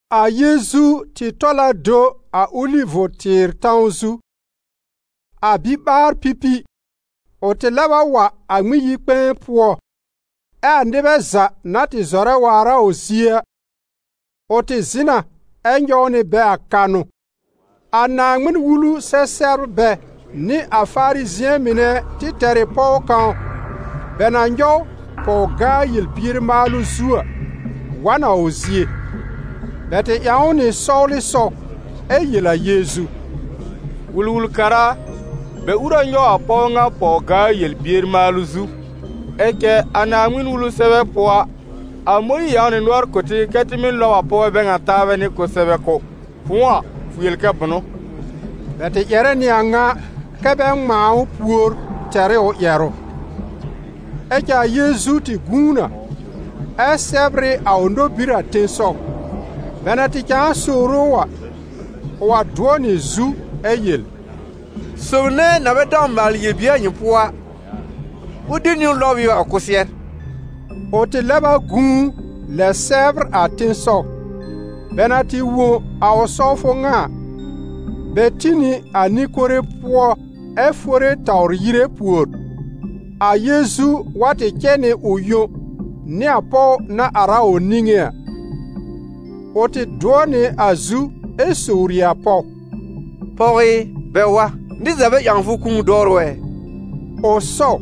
A Yeezu tɩ tɔl a do a Olivʋ-tɩɩr tãw zu. A biɓaar-pipi, ʋ tɩ lɛb wa a Ŋmɩn-yi-kpɛ̃ɛ pʋɔ, ɛ a nɩbɛ za na tɩ zɔrɛ waar a ʋ zie a, ʋ tɩ zɩ̃ na ɛ nyɔw nɩ bɛ a kanʋ. A Naaŋmɩn-Wulu-sɛ-sɛbrbɛ nɩ a Farizɩ̃ɛ mɩnɛ tɩ tɛr ɩ pɔw kãw, bɛ na nyɔw pɔw-gaa yel-bier maalʋ zu a, wa n a ʋ zie. Bɛ tɩ ƴãw ʋ nɩ sɔwlɩsɔw ɛ yel a Yeezu: «Wul-wul-kara a, bɛ ur a nyɔw a pɔw ŋa pɔw-gaa yel-bier maalʋ zu. Ɛ cɛ a Naaŋmɩn-Wulu sɛbɛ pʋɔ a, a Mõyiir ƴãw nɩ nʋɔr kʋ̀ tɩ kɛ tɩ mɩ́ lɔb a pɔwbɛ bɛ ŋa taabɛ nɩ kʋsɛbɛ kʋ́. Fʋ̃ʋ a, fʋ yel kɛ bʋnʋ?» Bɛ tɩ ƴɛrɛ nɩ a ŋa kɛ́ bɛ ŋmãa ʋ pùor tɛr ɩ ʋ ƴɛrʋ. Ɛ cɛ a Yeezu tɩ gũu na, ɛ sɛbr ɩ a ʋ nobir a tẽsɔw. Bɛ na tɩ cãa sowre ʋ a, ʋ wa dʋɔ nɩ zu ɛ yel: «Sob nɛ na bɛ dãw maalɩ yel-bier a nyɩ pʋɔ a, ʋ de niwn lɔb ɩ ʋ a kʋsɩɛr.» Ʋ tɩ lɛb a gũu, lɛ sɛbr a tẽsɔw. Bɛ na tɩ wõ a ʋ sɔwfʋ ŋa a, bɛ tĩ nɩ a nɩ-kore pʋɔ ɛ fore tawr yire pùor. A Yeezu wa tɩ cɛ nɩ ʋ yõ, nɩ a pɔw na ar a ʋ niŋé a. Ʋ tɩ dʋɔ nɩ a zu ɛ sowri a pɔw: «Pɔw ɩ, bɛ wa? Nɩr za bɛ ƴãw fʋ kũu dɔwrʋ ɛ?» Ʋ sɔw: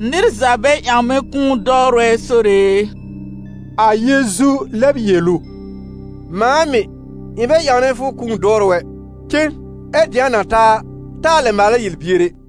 «Nɩr za bɛ ƴãw mɛ̃ kũu dɔwrʋ ɛ, Sore e.» A Yeezu lɛb yel ʋ: «Mãa mɩ̀, ɩ̃ bɛ ƴãwnɛ fʋ kũu dɔwrʋ ɛ. Cen, ɛ dɩ̃a na ta a, taa lɛ maalɛ yel-bier ɛ.»]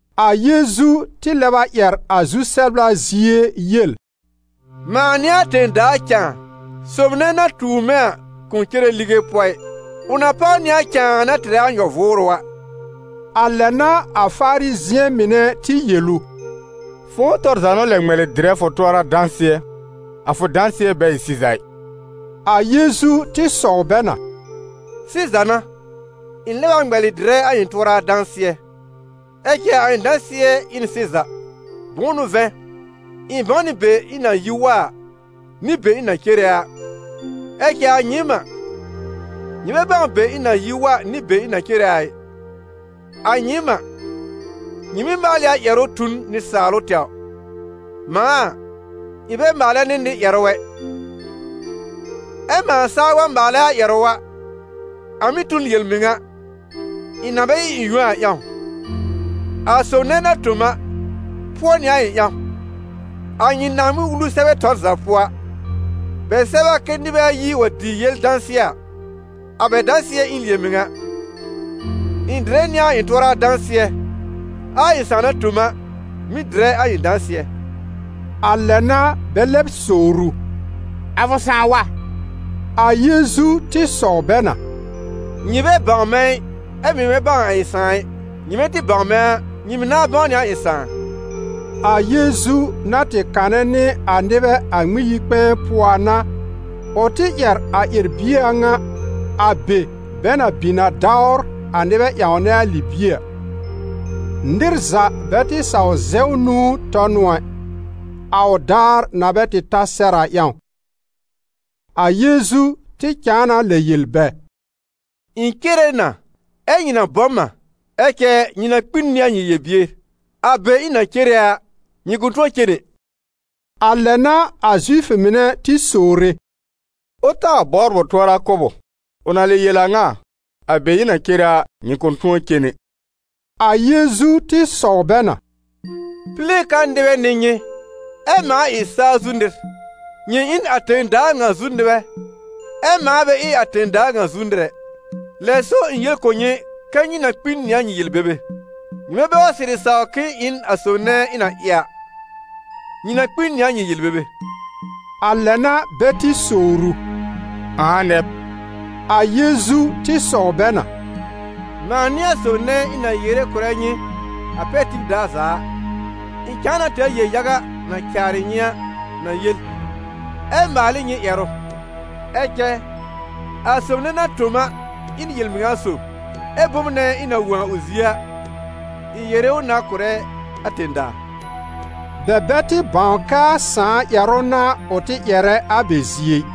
A Yeezu tɩ lɛb a ƴɛr a zu-sɛbla zie yel: «Mãa n'ɩ a tẽ-daa cãa, sob nɛ na tuur mɛ̃ a kʋ̃ cere lige pʋɔ ɩ, ʋ na páw nɩ a cãa na tɩrɛ a nyɔ-vʋʋrʋ a.» A lɛ n'a a Farizɩ̃ɛ mɩnɛ tɩ yel ʋ: «Fʋ̃ʋ tɔr za n'ʋ lɛ ŋmɛlɩ dɩrɛ fʋ tʋɔra dãsɩɛ, a fʋ dãsɩɛ bɛ ɩ sɩza ɩ!» A Yeezu tɩ sɔw bɛ na: «Sɩza n'a, ɩ̃ lɛb a ŋmɛlɩ dɩrɛ a ɩ̃ tʋɔra dãsɩɛ, ɛ cɛ a ɩ̃ dãsɩɛ ɩ n sɩza; bʋ̃ʋ n'ʋ vɛ̃, ɩ̃ bãw nɩ be ɩ̃ na yi wa a, nɩ be ɩ̃ na cere a; ɛ cɛ a nyɩɩm a, nyɩ bɛ bãw be ɩ̃ na yi wa nɩ be ɩ̃ na cere a ɩ. A nyɩɩm a, nyɩ mɩ́ maal ɩ a ƴɛrʋ tu n nɩsaalʋ tɛwr. Mãa a, ɩ̃ bɛ maalɛ nɩ nɩr ƴɛrʋ ɛ. Ɛ mãa saa wa maalɛ a ƴɛrʋ a, a mɩ́ tu n yel-mɩŋa, ɩ̃ na bɛ ɩ ɩ̃ yõ a ƴãw: a sob nɛ na tõ m a, pʋɔ nɩ a ɩ̃ ƴãw. A nyɩ Naaŋmɩn-Wulu sɛbɛ tɔr za pʋɔ a, bɛ sɛb a kɛ nɩbɛ ayi wa dɩ yel dãsɩɛ a, a bɛ dãsɩɛ ɩ n yel-mɩŋa. Ɩ̃ dɩrɛ nɩ a ɩ̃ tʋɔra dãsɩɛ, ɛ a ɩ̃ Sãà na tõ m a, mɩ̀ dɩrɛ a ɩ̃ dãsɩɛ.» A lɛ n'a bɛ lɛb sowr ʋ: «A fʋ Sãà wa?» A Yeezu tɩ sɔw bɛ na: «Nyɩ bɛ bãw mɛ̃ ɩ, ɛ mɩ̀ bɛ bãw a ɩ̃ Sãà ɩ. Nyɩmɛ tɩ bãw mɛ̃ a, nyɩ mɩ̀ nãá bãw nɩ a ɩ̃ Sãà.» A Yeezu na tɩ kanɛ nɩ a nɩbɛ a Ŋmɩn-yi-kpɛ̃ɛ pʋɔ a n'a, ʋ tɩ ƴɛr a ƴɛr-bie a ŋa, a be bɛ na bin a dawr a nɩbɛ ƴãwnɛ a libie a. Nɩr za bɛ tɩ saw zɛw nũu tɔ n ʋ ɛ, a ʋ daar na bɛ tɩ ta sɛr a ƴãw. A Yeezu tɩ cãa na lɛ yel bɛ: «Ɩ̃ cere na, ɛ́ nyɩ na bɔ m a; ɛ cɛ nyɩ na kpi n nɩ a nyɩ yel-bier. A be ɩ̃ na cere a, nyɩ kʋ̃ tʋɔ cen ɛ.» A lɛ n'a a Zifʋ mɩnɛ tɩ sowre: «Ʋ taa bɔbr ʋ tʋɔra kʋ́b ʋ? Ʋ na lɛ yel a ŋa a: ‹A be ɩ̃ na cere a, nyɩ kʋ̃ tʋ̃ɔ cen ɛ.›» A Yeezu tɩ sɔw bɛ na: «Pile ka nɩbɛ n'ɩ nyɩ, ɛ mãa ɩ saa zu nɩr; nyɩ ɩ n a tẽ-daa ŋa zu nɩbɛ, ɛ mãa bɛ ɩ a tẽ-daa ŋa zu nɩr ɛ. Lɛ so ɩ̃ yel kʋ̀ nyɩ kɛ́ nyɩ na kpi n nɩ a nyɩ yel-bebe. Nyɩmɛ bɛ wa sɩrɩ saw k'ɩ̃ɩ ‹ɩ n a sob nɛ ɩ̃ na ɩ a›, nyɩ na kpi n nɩ a nyɩ yel-bebe.» A lɛ n'a bɛ tɩ sowr ʋ: «Ãa nɛ b?» A Yeezu tɩ sɔw bɛ na: «Mãa n'ɩ a sob nɛ ɩ̃ na yere kʋ̀rɛ nyɩ a pɛr tib daar za a. Ɩ̃ cãa na tɛr yel-yaga na caarɩ nyɩ a na yel, ɛ maal ɩ nyɩ ƴɛrʋ; ɛ cɛ a sob nɛ na tõ m a ɩ n yel-mɩŋa sob, ɛ́ bom nɛ ɩ̃ na wõ a ʋ zie a, ɩ̃ yere ʋ na kʋ̀rɛ a tẽ-daa.» Bɛ bɛ tɩ bãw kɛ a Sãà ƴɛrʋ n'a ʋ tɩ ƴɛrɛ a bɛ zie ɩ.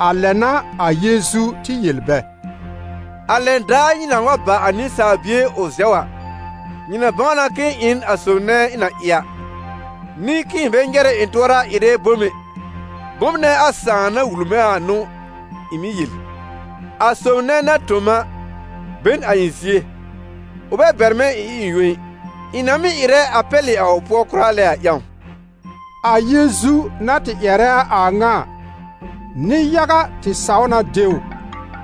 A lɛ n'a a Yeezu tɩ yel bɛ: «A lɛn daar nyɩ nãá wa ba a Nɩsaal Bie ʋ zɛw a, nyɩ na bãw na k'ɩ̃ɩ ‹ɩ n a sob nɛ ɩ̃ na ɩ a›, nɩ k'ɩ̃ɩ bɛ nyɛrɛ ɩ̃ tʋɔra ɩrɛ bom ɛ: bom nɛ a Sãà na wul mɛ̃ a n'ʋ ɩ̃ mɩ́ yel. A sob nɛ na tõ m a be n a ɩ̃ zie: ʋ bɛ bɛr mɛ̃ ɩ̃ ɩ ɩ̃ yõ ɩ, ɩ̃ na mɩ́ ɩrɛ a pɛlɩ a ʋ pʋɔ kʋra lɛ a ƴãw.» A Yeezu na tɩ ƴɛrɛ a a ŋa a, nɩ-yaga tɩ saw na de ʋ.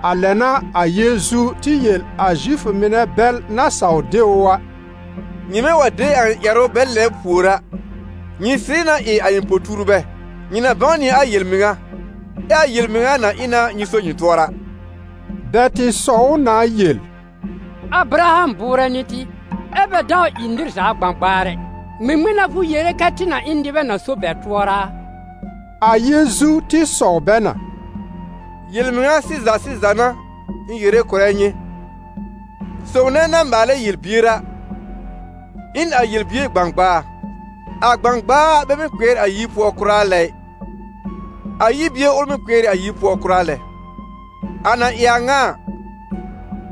A lɛ n'a a Yeezu tɩ yel a Zifʋ mɩnɛ bɛl na saw de ʋ a: «Nyɩmɛ wa de a ɩ̃ ƴɛrʋ bɛ lɛbr pùor a, nyɩ sɩrɩ na ɩ a ɩ̃ po-tuurbɛ, nyɩ na bãw nɩ a yel-mɩŋa, ɛ a yel-mɩŋa na ɩ na nyɩ so nyɩ tʋɔra.» Bɛ tɩ sɔw ʋ na yel: «Abraham bʋʋrɛ n'ɩ tɩ, ɛ́ bɛ dãw ɩ nɩr za gbãgbaar ɛ: ŋmɩŋmɩn n'a fʋ yere kɛ tɩ na ɩ n nɩbɛ na so bɛ tʋɔra a?» A Yeezu tɩ sɔw bɛ na: «Yel-mɩŋa sɩza sɩza n'a ɩ̃ yere na kʋ̀rɛ nyɩ, sob nɛ na maalɛ yel-bier a, ɩ n a yel-bier gbãgbaa. A gbãgbaa bɛ mɩ́ kpɩɛr a yir pʋɔ kʋra lɛ ɩ; a yir bie ʋl mɩ́ kpɩɛr ɩ a yir pʋɔ kʋra lɛ. A na ɩ a ŋa a,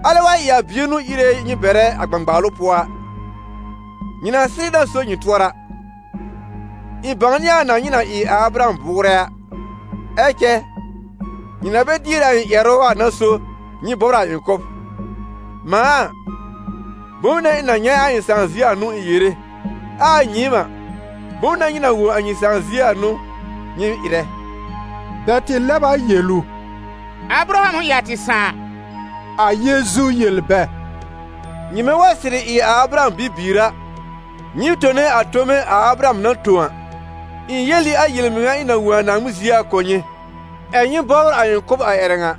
alɛ wa ɩ a Bie n'ʋ íre nyɩ bɛrɛ a gbãgbaalʋ pʋɔ a, nyɩ na sɩrɩ na so nyɩ tʋɔra. Ɩ̃ bãwnɩ a na nyɩ na ɩ a Abraham bʋʋrɛ a: ɛ cɛ nyɩ na bɛ dier a ɩ̃ ƴɛrʋ a n'a so nyɩ bɔbr a ɩ̃ kʋ́b. Mãa a, bom nɛ ɩ̃ na nyɛ̃ a ɩ̃ Sãà zie a n'ʋ ɩ̃ yere, ɛ a nyɩɩm a, bom nɛ nyɩ na wõ a nyɩ sãà zie a n'ʋ nyɩ ɩrɛ.» Bɛ tɩ lɛb a yel ʋ: «Abraham ʋ ɩ a tɩ sãà.» A Yeezu yel bɛ: «Nyɩmɛ wa sɩrɩ ɩ a Abraham bibiir a, nyɩɩm tone a tome a Abraham na tõ a. Ɩ̃ yel ɩ a yel-mɩŋa ɩ̃ na wõ a Naaŋmɩn zie a kʋ̀ nyɩ, ɛ̀ nyɩ bɔbr a ɩ̃ kʋ́b a ƴɛrɛ ŋa.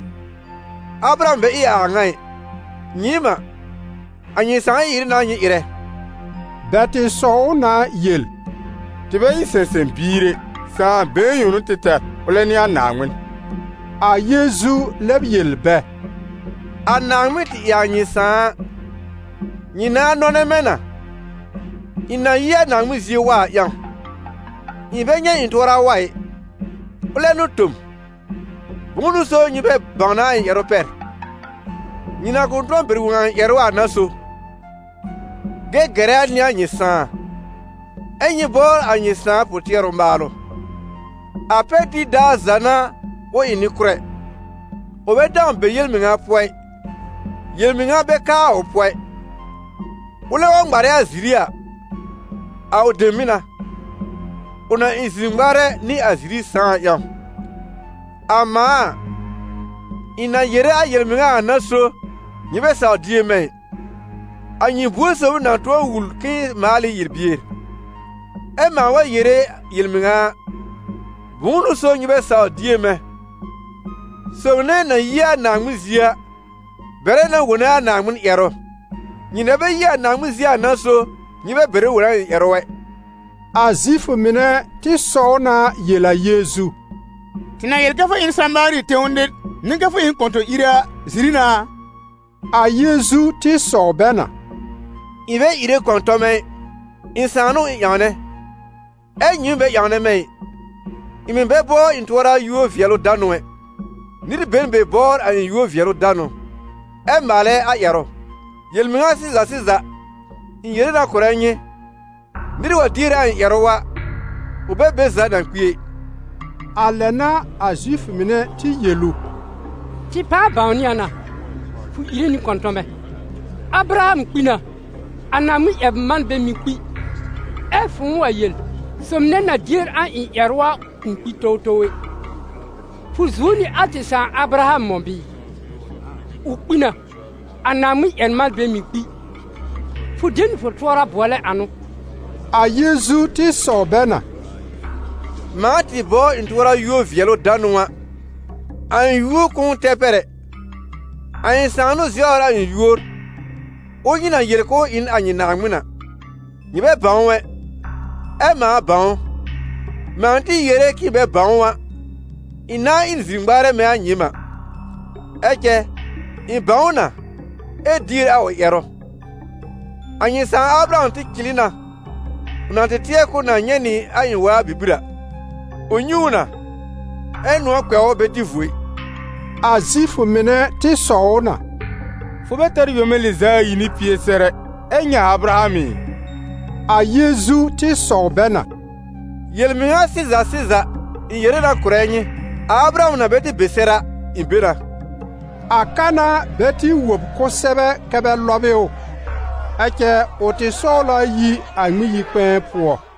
Abraham bɛ ɩ a a ŋa ɩ. Nyɩɩm a, a nyɩ sãà ɩ-ɩrɩ n'a nyɩ ɩrɛ.» Bɛ tɩ sɔw ʋ na yel: «Tɩ bɛ ɩ sɛ̃sɛ̃-biir ɛ! Sãa been yõ n'ʋ tɩ tɛr, ʋlɛ n'ɩ a Naaŋmɩn!» A Yeezu lɛb yel bɛ: «A Naaŋmɩn tɩ ɩ a nyɩ sãà a, nyɩ nãá nɔnɛ mɛ̃ na, ɩ̃ na yi a Naaŋmɩn zie wa a ƴãw; ɩ̃ bɛ nyɛ̃ ɩ̃ tʋɔra wa ɩ, ʋlɛ n'ʋ tõ m. Bʋ̃ʋ n'ʋ so nyɩ bɛ bãwnɛ a ɩ̃ ƴɛrʋ pɛr? Nyɩ na kʋ̃ tʋ̃ɔ bɛr wõ a ɩ̃ ƴɛrʋ a n'a so. Gɛgɛra n'ɩ a nyɩ sãà, ɛ́ nyɩ bɔbr a nyɩ sãà pʋ-tɩɛrʋ maalʋ. A pɛr tib daar za n'a ʋ ɩ nɩ-kʋ́rɛ: ʋ bɛ dãw be yel-mɩŋa pʋɔ ɩ, yel-mɩŋa bɛ ka a ʋ pʋɔ ɩ. Ʋlɛ wa ŋmarɛ a ziri a, a ʋ dem mɩ́ n'a, ʋ na ɩ zir-ŋmarɛ nɩ a ziri sãà a ƴãw. A mãa a, ɩ̃ na yere a yel-mɩŋa a n'a so nyɩ bɛ sawr dier mɛ̃ ɩ. A nyɩ buor sob ʋ na tʋ̃ɔ wul k'ɩ̃ɩ maal ɩ yel-bier? Ɛ́ mãa wa yere yel-mɩŋa a, bʋ̃ʋ n'ʋ so nyɩ bɛ sawr dier mɛ̃? Sob nɛ na yi a Naaŋmɩn zie a bɛrɛ na wone a Naaŋmɩn ƴɛrʋ; nyɩ na bɛ yi a Naaŋmɩn zie a n'a so nyɩ bɛ bɛrɛ wone a ɩ̃ ƴɛrʋ ɛ.» A Zifʋ mɩnɛ tɩ sɔw na yel a Yeezu: «Tɩ na yel kɛ fʋ ɩ n Samaari tẽw nɩr, nɩ kɛ fʋ ɩ n kɔ̃tɔ̃-ire a, ziri n'a a?» A Yeezu tɩ sɔw bɛ na: «Ɩ̃ bɛ ìre kɔ̃tɔmɛ ɩ, ɩ̃ Sãà n'ʋ ɩ̃ ƴãwnɛ, ɛ́ nyɩɩm bɛ ƴãwnɛ mɛ̃ ɩ! Ɩ̃ mɩ̀ bɛ bɔbr ɩ̃ tʋɔra yúor-vɩɛlʋ-danʋ ɛ. Nɩr be n be bɔbr a ɩ̃ yúor-vɩɛlʋ-danʋ ɛ maalɛ a ƴɛrʋ. Yel-mɩŋa sɩza sɩza, ɩ̃ yere na kʋ̀rɛ nyɩ: nɩr wa dier a ɩ̃ ƴɛrʋ a, ʋ bɛ be za na kpi ɛ.» A lɛ n'a a Zifʋ mɩnɛ tɩ yel ʋ: «Tɩ pãa bãwnɩ a na, fʋ ìre nɩ kɔ̃tɔmɛ! Abraham kpi na, a Naaŋmɩn-ƴɛr-manbɛ mɩ̀ kpi, ɛ fʋ̃ʋ wa yel: ‹Sob nɛ na dier a ɩ̃ ƴɛrʋ a kʋ̃ kpi towtow ɛ›. Fʋ zuo nɩ a tɩ sãà Abraham mɔ̃ bɩɩ? Ʋ kpi na. A Naaŋmɩn-ƴɛr-manbɛ mɩ̀ kpi! Fʋ de nɩ fʋ tʋɔra bʋɔlɛ ãnʋ?» A Yeezu tɩ sɔw bɛ na: «Mãa tɩ bɔbr ɩ̃ tʋɔra yúor-vɩɛlʋ-danʋ a, a ɩ̃ yúor kʋ̃ʋ tɛr pɛr ɛ. A ɩ̃ Sãà n'ʋ zɛwr a ɩ̃ yúor, ʋl nyɩ na yel k'ʋʋ ɩ n a nyɩ Naaŋmɩn a. Nyɩ bɛ bãw ʋ ɛ, ɛ mãa bãw ʋ. Mãa tɩ yere k'ɩ̃ɩ bɛ bãw ʋ a, ɩ̃ nãa ɩ n zir-ŋmarɛ mɛ̃ a nyɩɩm a, ɛ cɛ ɩ̃ bãw ʋ na, ɛ dier a ʋ ƴɛrʋ. A nyɩ sãà Abraham tɩ cɩlɩ na, ʋ na tɩ tɩɛr k'ʋʋ na nyɛ̃ nɩ a ɩ̃ waa bibir a: ʋ nyɛ̃ ʋ na, ɛ́ nʋ̃ɔ̀ kpɛ̃ ʋ bɛ dɩ vuo ɩ.» A Zifʋ mɩnɛ tɩ sɔw ʋ na: «Fʋ bɛ tɛr yome lɩz'a ayi nɩ pie sɛr ɛ, ɛ nyɛ̃ a Abraham ɩ?» A Yeezu tɩ sɔw bɛ na: «Yel-mɩŋa sɩza sɩza, ɩ̃ yere na kʋ̀rɛ nyɩ, a Abraham na bɛ tɩ be sɛr a, ɩ̃ be na.» A ka n'a bɛ tɩ wob kʋsɛbɛ kɛ bɛ lɔb ɩ ʋ. Ɛ cɛ ʋ tɩ sɔwl a yi a Ŋmɩn-yi-kpɛ̃ɛ pʋɔ.